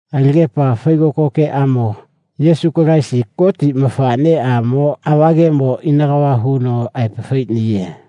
Alagepa faigoko geʼamo Yesu Kalaisi Goti mafaʼneʼamo ava gemo ina kava huno aepa faiʼniye.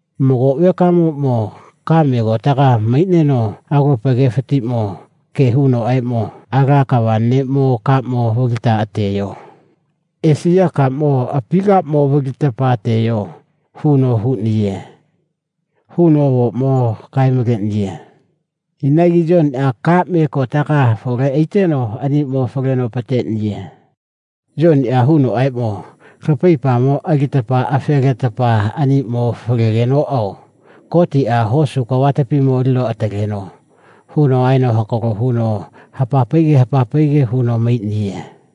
Mago vekamoʼmo kaʼme kotega maiʼneno alopa gefatiʼmo ge hunoʼaeʼmo, Ala kava neʼmo kaʼmo valita ateyo. Esiya kaʼmo api kaʼmo valita ateyo, huno huʼniye, huno avoʼmo kae maleʼniye. Inagi Yoniʼa kaʼme kotegamo afole aiteno aniʼmo faleno apateʼniye. Yoniʼa hunoʼaeʼmo, lapaipamo alita afe letetapa aniʼmo falegenoʼao Gotiʼa hosu kavatapimo alino ataleno, huno aeno hakalo huno hapa paige hapa paige huno maiʼniye.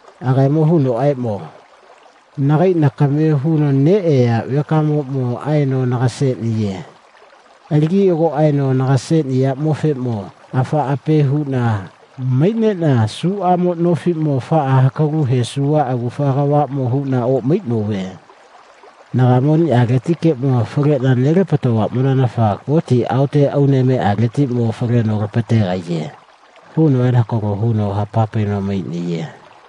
Agaemo hunoʼaeʼmo, nagae nakame huno neʼeya vekamoʼmo aeno naga seʼniye. Alagi ago aeno naga seʼniyaʼmofeʼmo afaʼa ape huʼna maiʼneʼna suʼamo nofiʼmo afaʼa hakalu hesuva agufa kavaʼmo huʼna oʼmaiʼnove. Nagaemo aniʼaletikeʼmo faleʼna nelapatovaʼmonanafa Goti aote Aunemeʼaletiʼmo faleno lapategaiye, huno aeno hakalo huno hapa paino maiʼniye.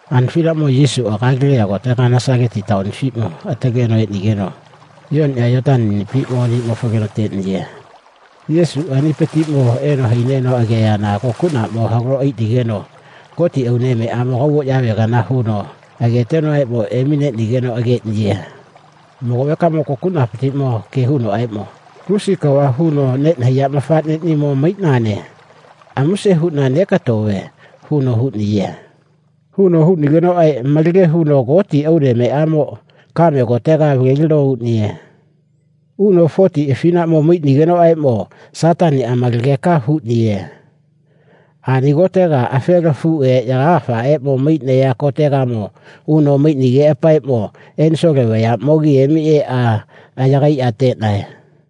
Ani afinaʼmo Yesuʼa Galeliya kotega Nasalasa taonifatiʼmo ataleno eʼnigeno Yoniʼa Yoneni anipiʼmo aniʼmo faleno ateʼniye. Yesuʼaanipatiʼmo eno haineno ageyana kokuʼnaʼmo halo aiʼnigeno Goti Aunemeʼamo kaugoyavegana huno agaetegamo emineʼnigeno ageʼniye. Mago vekaʼmoʼmo kokuʼnapatiʼmo ge hunoʼaeʼmo, lusi kava huno neʼnahaiya mafaʼneʼnimo maiʼnane. Amuse huʼna nekatove, huno huʼniye. Huno huʼnigenoʼaeʼmo malage huno Goti Aunemeʼamoʼmo kame kotegamo avalelino uʼniye. Uno fotiʼa afinaʼmo maiʼnigenoʼaeʼmo Sataniʼaamalageka huʼniye. Ani kotega afela afuʼe yagagafaʼeʼmo maiʼnaya kotegamo uno maiʼnigeʼapaeʼmo enisole vayaʼmogimo emi eʼa yagaiʼa ateʼnae.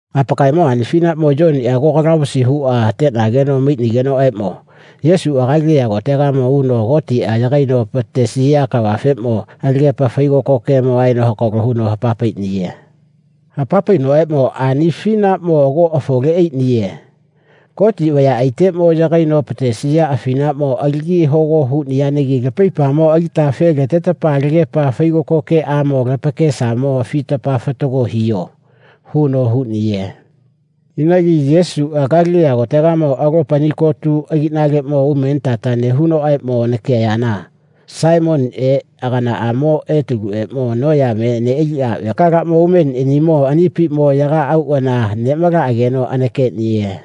Apakaemo ani afinaʼmo Yoniʼa ago kalavusi huʼa ateʼnageno maiʼnigenoʼaeʼmo Yesuʼa Galeliya kotegamo uno Gotiʼa yagaino apatesiya kavafeʼmo alagepa faigoko gemo aeno hakalo huno hapa paiʼniye. Hapa painoʼaeʼmo, ani afinaʼmo ago afole aiʼniye. Gotiʼa vayaʼaiteʼmo yagaino apatesiya afinaʼmo alagi hogo huʼniyanagi lapaipamo alita afe letetapa alagepa faigoko geʼaeʼmo lapakesamo afita fatago hiyo, huno huʼniye. Inagi Yesuʼa Galeliya kotegamo alopa ani kotu agiʼnaleʼmo umenitata nehunoʼaeʼmo ageyana Saimoniʼe aganaʼamo Etaluʼeʼmo noyame neʼaliʼa vekalaʼmo umeniʼanimo anipiʼmo yaga auʼana neʼmalaʼageno anakeʼniye.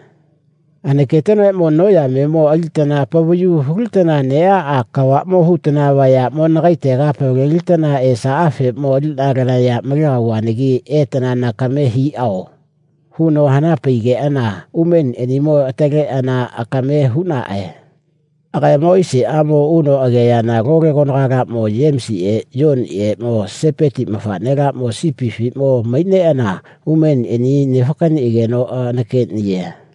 Anaketenoʼaeʼmo noyamemo alitana apavayu hulitana neʼaʼa kavaʼmo hutana vayaʼmo nagaetega apavalelitana esaʼafeʼmo aliʼna lanaya malegauvanagi etana nakame hiʼao, huno hana paiʼnigeʼana umeniʼanimo ataleʼeʼana akame huʼnaʼae. Agaemo aiseʼamo uno ageyana lole konagalaʼmo Yemisiʼe Yoniʼeʼmo Sepeti mafaʼnelaʼmo sipifiʼmo maiʼneʼana umeniʼanimo nefakaniʼageno anakeʼniye.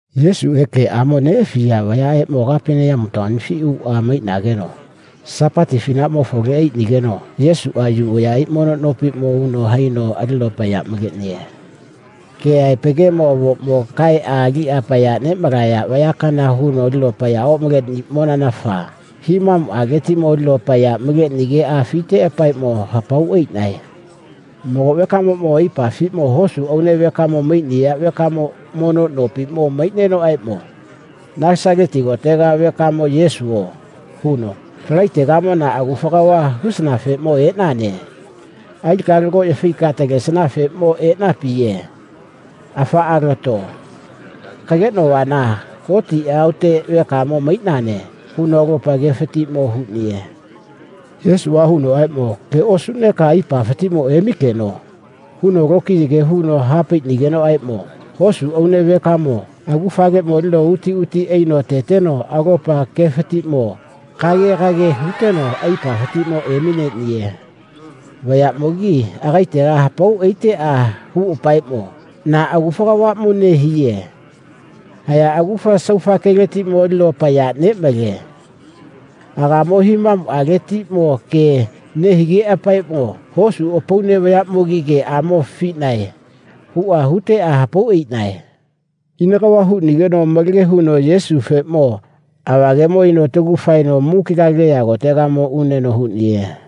Yesuʼe geʼamo neʼafiya vayaʼeʼmo Kapeneyamu taonifiʼmo uʼa maiʼnageno Sapati afinaʼmo afole aiʼnigeno Yesuʼa Yu vayaʼai mono nopiʼmo uno haino alino apaya maleʼniye. Keʼaepa gemo avoʼmo kaeʼa aliʼa apaya neʼmalaya vayakana huno alino apaya oʼmaleʼniyaʼmonanafa himamuʼaletiʼmo alino apaya maleʼnigeʼa afiteʼapaeʼmo hapau aiʼnae. Mago vekamo aipafiʼmo hosu aune vekamo maiʼniya vekamo mono nopiʼmo maiʼnenoʼaeʼmo, Nasalasa kotega vekamo Yesuo, huno, lagaetegamo na agufa kava hisanafeʼmo eʼnane. Alika lagoʼya faika latalegefeʼmo eʼnapiye. Afaʼa lato. Kageʼnovana Goti aote vekamo maiʼnane, huno alopa gefatiʼmo huʼniye. Yesuʼa hunoʼaeʼmo, Ge osuʼneka aipafatiʼmo emikeno, huno lokiya ge huno ha paiʼnigenoʼaeʼmo hosu aune vekamoʼmo agufaleʼmo alino uti uti aino ateteno alopa gefatiʼmo kagegage huteno aipafatiʼmo emineʼniye. Vayaʼmogi ageteʼa hapau aiteʼa huʼapaeʼmo, na agufa kavaʼmo nehiye. Haiya agufa saufa geletiʼmo alino apaya neʼmale. Agaemo himamuʼaletiʼmo ge nehigeʼapaeʼmo hosu apaune vayaʼmogi geʼamo afiʼnae, huʼa huteʼa hapau aiʼnae. Ina kava huʼnigeno malage huno Yesufeʼmo ava gemoʼmo aino atagu faeno muki Galeliya kotegamo uneno huʼniye.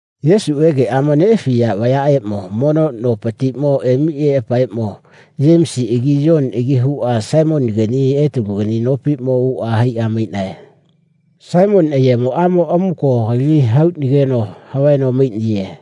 Yesuʼe geʼamo neʼafiya vayaʼeʼmo mono nopatiʼmo emi eʼapaeʼmo Yemisiʼagi Yoniʼagi huʼa Saimonigani Etalugani nopiʼmo uʼa haiʼa maiʼnae. Saimoni ayemoʼamoʼmo amuko kaitaʼmo hauʼnigeno havaeno maiʼniye.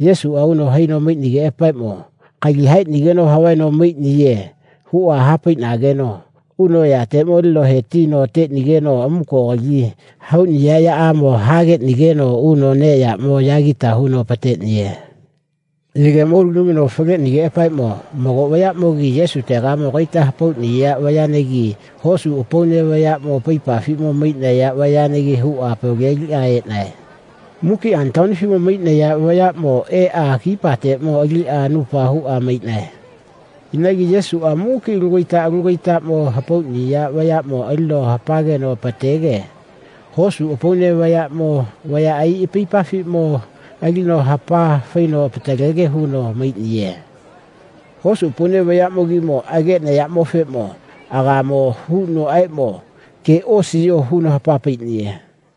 Yesuʼa uno haino maiʼnigeʼapaeʼmo, kaita hauʼnigeno havaeno maiʼniye, huʼa ha paiʼnageno uno ayateʼmo alino he tino ateʼnigeno amuko kaita hauʼniya yaʼamo hageʼnigeno uno neʼyaʼmo yagita huno apateʼniye. Yegemo uno lamino faleʼnigeʼapaeʼmo mago vayaʼmogi Yesutegamo kaita hapauʼniya vayanagi hosu apaune vayaʼmo apaipafiʼmo maiʼnaya vayanagi huʼa apavaleliʼa eʼnae. Muki ani taonifiʼmo maiʼnaya vayaʼmo eʼa kipateʼmo aliʼa anupa huʼa maiʼnae. Inagi Yesuʼa muki alu kaita alu kaitaʼmo hapauʼniya vayaʼmo alino hapageno apatege hosu apaune vayaʼmo vayaʼai apaipafatiʼmo alino hapa faino apatalege huno maiʼniye. Hosu apaune vayaʼmogimo ageʼnayaʼmofeʼmo agaemo hunoʼaeʼmo, ge osiyo, huno hapa paiʼniye.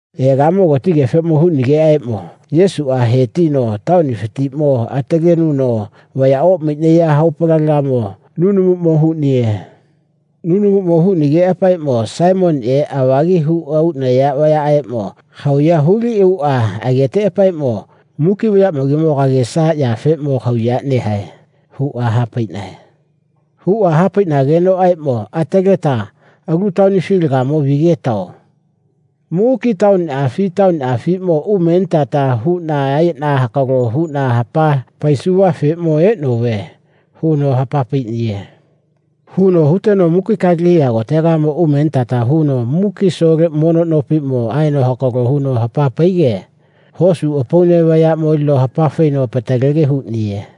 Egamo gotigefeʼmo huʼnigenoʼaeʼmo Yesuʼa he tino taonifatiʼmo atalenuno vaya oʼmaiʼnaya haopalegamo nunumuʼmo huʼniye. Nunumuʼmo huʼnigeʼapaeʼmo Saimoniʼe avagi huʼa uʼnaya vayaʼeʼmo kahauya huliʼuʼa ageteʼapaeʼmo, muki vayaʼmogimo kagesayafeʼmo kahauya nehae, huʼa ha paiʼnae. Ha paiʼnagenoʼaeʼmo ataleta, alu taonifilagamo vigetao. Muki taoniʼafi taoniʼafiʼmo umenitata huʼna aeʼna hakalo huʼna hapa paisuvafeʼmo eʼnove, huno hapa paiʼniye. Huno huteno muki Galeliya kotegamo umenitata huno muki asole mono nopiʼmo aeno hakalo huno hapa paige hosu apaune vayaʼmo alino hapafaino apatalege huʼniye.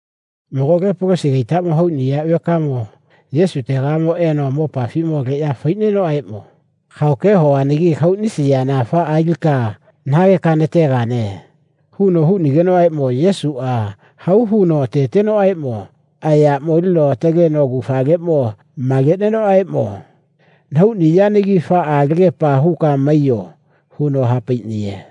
Mago lepolosi kaitaʼmo hauʼniya vekamo Yesutegamo eno mopafiʼmo aleʼya faiʼnenoʼaeʼmo, kahao ke hovanagi kahauʼnisiyana afaʼa alika nahageka nategane, huno huʼnigenoʼaeʼmo Yesuʼa hau huno atetenoʼaeʼmo ayaʼmo alino ataleno agufaleʼmo maleʼnenoʼaeʼmo, nahauʼniyanagi afaʼa alagepa huka maiyo, huno ha paiʼniye.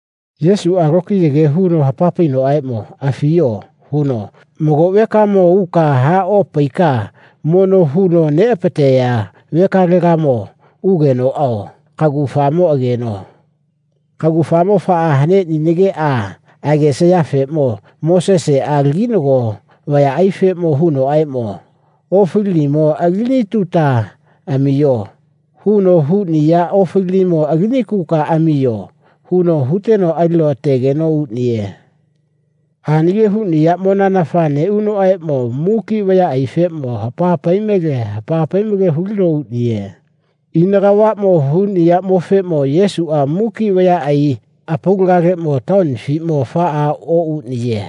Yesuʼa lokiya ge huno ha painoʼaeʼmo, afiyo, huno, mago vekaeʼmo uka ha opaika mono huno neʼapateya vekalegageʼmo ugenoʼao kagufamo ageno. Kagufamo afaʼa haneʼninageʼa agesayafeʼmo Moseseʼa laginago vayaʼaifeʼmo hunoʼaeʼmo, ofalinimo alinituta amiyo, huno huʼniya ofalinimo alinikuka amiyo, huno huteno alino ategeno uʼniye. Ani ge huʼniyaʼmonanafa neʼunoʼaeʼmo muki vayaʼaifeʼmo hapa pai male hapa pai male hulino uʼniye. Ina kavaʼmo huʼniyaʼmofeʼmo Yesuʼa muki vayaʼai apaulagaleʼmo taonifiʼmo afaʼa oʼuʼniye.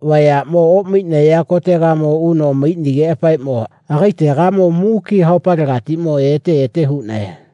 Vayaʼmo oʼmaiʼnaya kotegamo uno maiʼnigeʼapaeʼmo agaetegamo muki haopalegatiʼmo ete ete huʼnae.